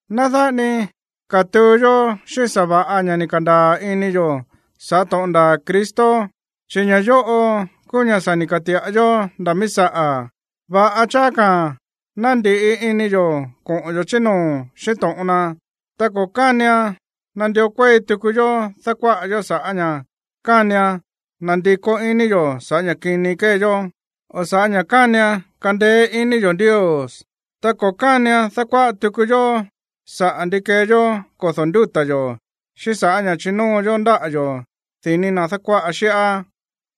Ná dáꞌa ni katuu yó xíꞌín sa̱va̱ꞌa ña̱ ni̱ ka̱ndaa̱ ini yo̱ sa̱ꞌá to̱ꞌon ndaa̱ Cristo, chi̱ ña̱ yóꞌo kúú ña̱ sa̱ ni̱ ka̱ti̱ꞌa yó nda̱ míí saꞌa̱. Va̱ꞌa cháá ka̱ ná ndi̱ꞌi ini yo̱ koꞌo̱n yo̱ chí noo̱ xíꞌín to̱ꞌon na, ta ko̱ kánian nandió kuéi tuku yó dákuáꞌa yó sa̱ꞌá ña̱ kánian nandikó iní yo̱ sa̱ꞌá ña̱ kini kée yó, o sa̱ꞌá ña̱ kánian kandeé iní yo̱ Ndios. Ta ko̱ kánian dákuáꞌa tuku yó saꞌa̱ ndi kee yó kodo̱ ndúta̱ yo̱, xíꞌín sa̱ꞌá ña̱ chínóo yó ndáꞌa̱ yo̱ dini̱ na̱ dákuáꞌa xíꞌá,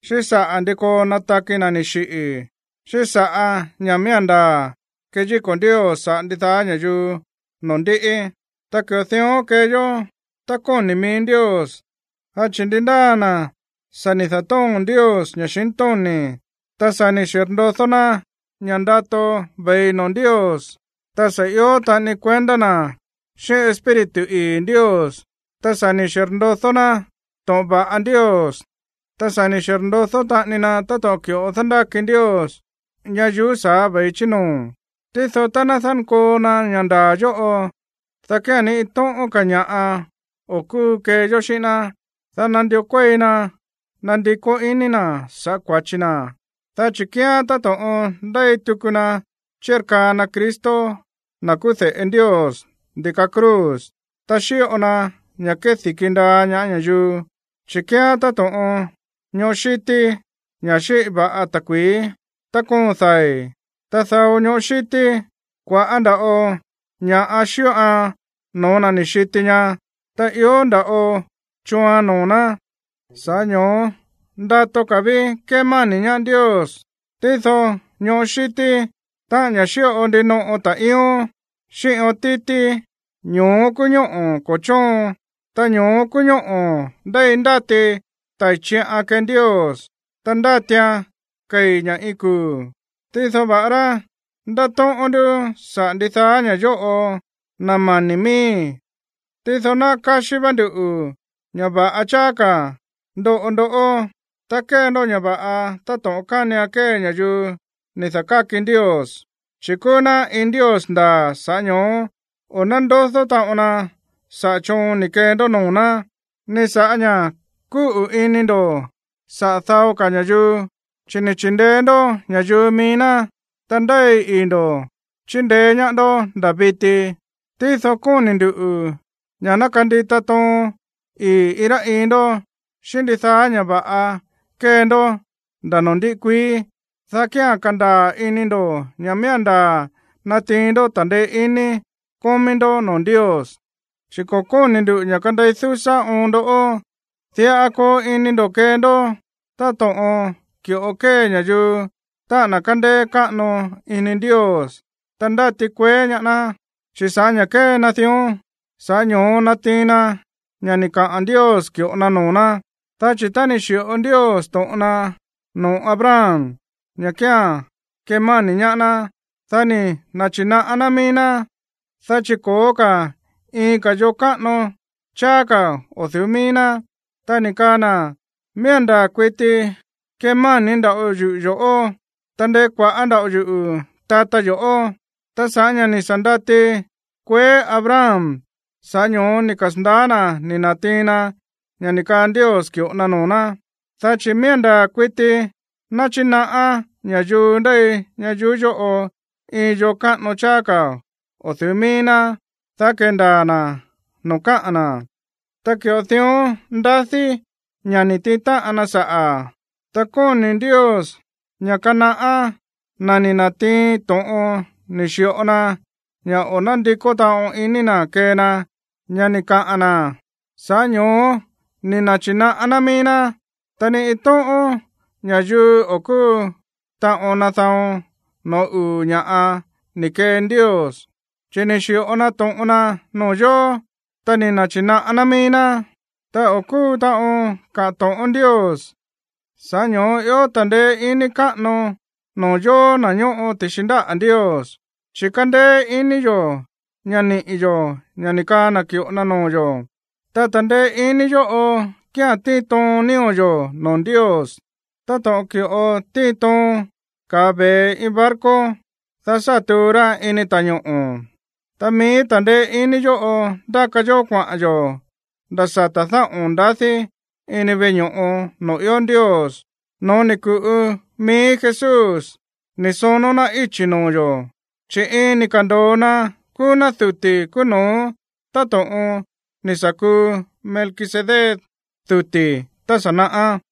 xíꞌín saꞌa̱ ndi koo nataki na̱ ni̱ xiꞌi̱, xíꞌín sa̱ꞌá ña̱ miía̱n ndaa̱ keyíko̱ Ndios saꞌa̱ ndidaá ña̱yuu noo̱ ndiꞌi. Ta ki̱ꞌo dión kee yó tá kóni̱ mií Ndios. Dá chi̱ ndi ndáa na̱ sa̱ ni̱ da̱tóo̱n Ndios ña̱xintóni̱, ta sa̱ ni̱ xirndodó ná ña̱ ndato ve̱i noo̱ Ndios, ta sa̱ ió taꞌani kuendá na̱ xíꞌín Espíritu ii̱ Ndios, ta sa̱ ni̱ xirndodó ná to̱ꞌon va̱ꞌa Ndios, ta sa̱ ni̱ xirndodó taꞌani na táto̱ꞌon ki̱ꞌo dándáki Ndios ñayuú sa̱á ve̱i chí noo̱, tído tá ná dánkoo na ña̱ ndaa̱ yóꞌo, dá kía̱n ni iin tóꞌón ka̱ ña̱ꞌa o̱ kúu kee yó xíꞌín ná, dá nandió kuéi na nandikó iní na̱ sa̱ꞌá kua̱chi na̱, dá chi̱ kíán táto̱ꞌon ndéi tuku na chírkaa na Cristo, na̱ kúú de̱ꞌe Ndios, ndi̱ka cruz, ta xíꞌo na ña̱ kedi̱ki ndaa ñaá ña̱yuu. Chi̱ kíán táto̱ꞌon ñoꞌó xítí, ña̱ xíꞌi va̱ꞌan ta̱kui̱í tá koon dai̱. Ta dao ñoꞌó xítí, kua̱ꞌá nda̱ꞌo ña̱ꞌa xíꞌoan no̱ó na̱ ni̱ xiti ñaá, ta ió nda̱ꞌo chooan noo̱ ná. Sa̱ꞌá ño̱ó ndato ka̱ ví kémáni̱ ñaá Ndios. Tído ñoꞌó xítí, táꞌa̱n ña̱ xíꞌo ndinoꞌo ta̱ꞌíón xíꞌín ión títí, ño̱ó kúú ñóꞌo̱ ko̱ chóon, ta ño̱ó kúú ñóꞌo̱ ndéi ndáti tai̱ chiꞌan kee Ndios, ta ndátian kei̱ ña̱ iin kuu̱. Tído va̱ꞌará ndátóꞌón ndú saꞌa̱ ndidaá ña̱ yóꞌo, na̱ mani̱ miíi̱, tído náꞌá káxí vá ndú ña̱ va̱ꞌa cháá ka̱ ndoꞌo ndoꞌó, ta kee ndó ña̱ va̱ꞌa táto̱ꞌon kánian kee ña̱yuu ni̱ da̱káki Ndios. Chi̱ kúú ná iin Ndios ndaa̱, sa̱ꞌá ño̱ó o̱ nándodó taꞌon na saꞌa̱ choon ni̱ kee ndó noo̱ ná, ni sa̱ꞌá ña̱ kúꞌu̱ ini ndo̱ saꞌa̱ dao ka̱ ña̱yuu, chi̱ ni̱ chi̱ndeé ndó ña̱yuu mií ná, ta ndéi ii̱ ndo̱ chíndeé ñaá ndó nda̱ viti. Tído kóni̱ nduꞌu̱ ña̱ ná kandita toon ii̱ iin rá iin ndó xíꞌín ndidaá ña̱ va̱ꞌa kée ndó nda̱ noo̱ ndiꞌi kuií, dá kía̱n kandaa̱ ini ndo̱ ña̱ miía̱n ndaa̱ natiin ndó ta̱ndeé iní kómí ndó noo̱ Ndios. Chi̱ ko̱ kóni̱ ndu̱ ña̱ kandei dúsá oon ndó. Diꞌa koo ini ndo̱ kee ndó táto̱ꞌon ki̱ꞌo kée ña̱yuu, táꞌa̱n na̱ kándéé káꞌano ini Ndios, ta ndáti kueé ñaá ná, chi̱ sa̱ꞌá ña̱ kée na dión, sa̱ꞌá ño̱ó natiin na ña̱ ni̱ kaa Ndios ki̱ꞌo na noo̱ ná. Dá chi̱ tá ni̱ xi̱ꞌo Ndios to̱ꞌon na noo̱ Abraham ña̱ kía̱n kemáni̱ ñaá ná, dá ni̱ na̱chi̱naꞌá ná mií ná, dá chi̱ ko̱ó ka̱ iin ka̱ yo̱ káꞌano cháá ka̱ o̱ du̱ú mií ná, ta ni̱ kaa na̱: “Miía̱n ndaa̱ kuiti kemáni̱ nda̱ꞌo yuꞌu̱ yo̱ꞌó, ta ndekuaꞌa̱ nda̱ꞌo yuꞌu̱ tata yo̱ꞌó.” Ta sa̱ꞌá ña̱ ni̱ sa̱ ndati kueé Abraham, sa̱ꞌá ño̱ó ni̱ kasa̱ndaá na̱ ni̱ na̱tiin na ña̱ ni̱ kaa Ndios ki̱ꞌo na noo̱ ná. Dá chi̱ miía̱n ndaa̱ kuiti náchinaꞌá ña̱yuu ndéi ña̱yuu yóꞌo iin yoo káꞌano cháá ka̱ o̱ du̱ú mií ná, dá kéndaa̱ na̱ noo̱ káꞌa̱n na̱. Ta ki̱ꞌo dión ndadí ña̱ ni̱ tiin táꞌan na saꞌa̱. Ta kóni̱ Ndios ña̱ kanaꞌá na̱ ni̱ na̱tiin to̱ꞌon ni̱ xi̱ꞌo na ña̱ o̱ nándikó taꞌon iní na̱ kee na ña̱ ni̱ kaꞌa̱n na̱, sa̱ꞌá ño̱ó ni̱ na̱chi̱naꞌá ná mií ná. Ta ni iin tóꞌón ña̱yuu o̱ kúu taꞌon nada̱on no̱ó uu̱ ña̱ꞌa ni̱ kee Ndios, chi̱ ni̱ xi̱ꞌo na to̱ꞌon na noo̱ yo̱, ta ni̱ na̱chi̱naꞌá ná mií ná, ta o̱ kúu taꞌon kaꞌa̱n to̱ꞌón Ndios. Sa̱ꞌá ño̱ó ió iin ta̱ndeé iní káꞌano noo̱ yóó, na̱ ñóꞌo ti̱xi ndáꞌa̱ Ndios, chi̱ kándéé iní yo̱ ña̱ niꞌi̱ yo̱ ña̱ ni̱ kaa na̱ ki̱ꞌo na noo̱ yo̱. Ta ta̱ndeé iní yóꞌo kía̱n tíin toon nío̱ yo̱ noo̱ Ndios táto̱ꞌon ki̱ꞌo tíin toon ka̱a ve̱e iin barco, dá sá tuu ra ini ta̱ñoꞌo̱. Ta mií ta̱ndeé iní yóꞌo ndáka yó kuaꞌa̱n yo̱ nda̱ sata̱ dáꞌo̱n ndadí ini veꞌe ño̱ꞌo noo̱ ió Ndios, no̱ó ni̱ ku̱ꞌu mií Jesús ni̱ sonó ná íchi̱ noo̱ yo̱, chi̱ iin ni̱ ka̱ndo̱o na kúú duti̱ kúú no̱ó táto̱ꞌon ni̱ sa̱ kuu Melquisedec duti̱ tá sa̱ naꞌá.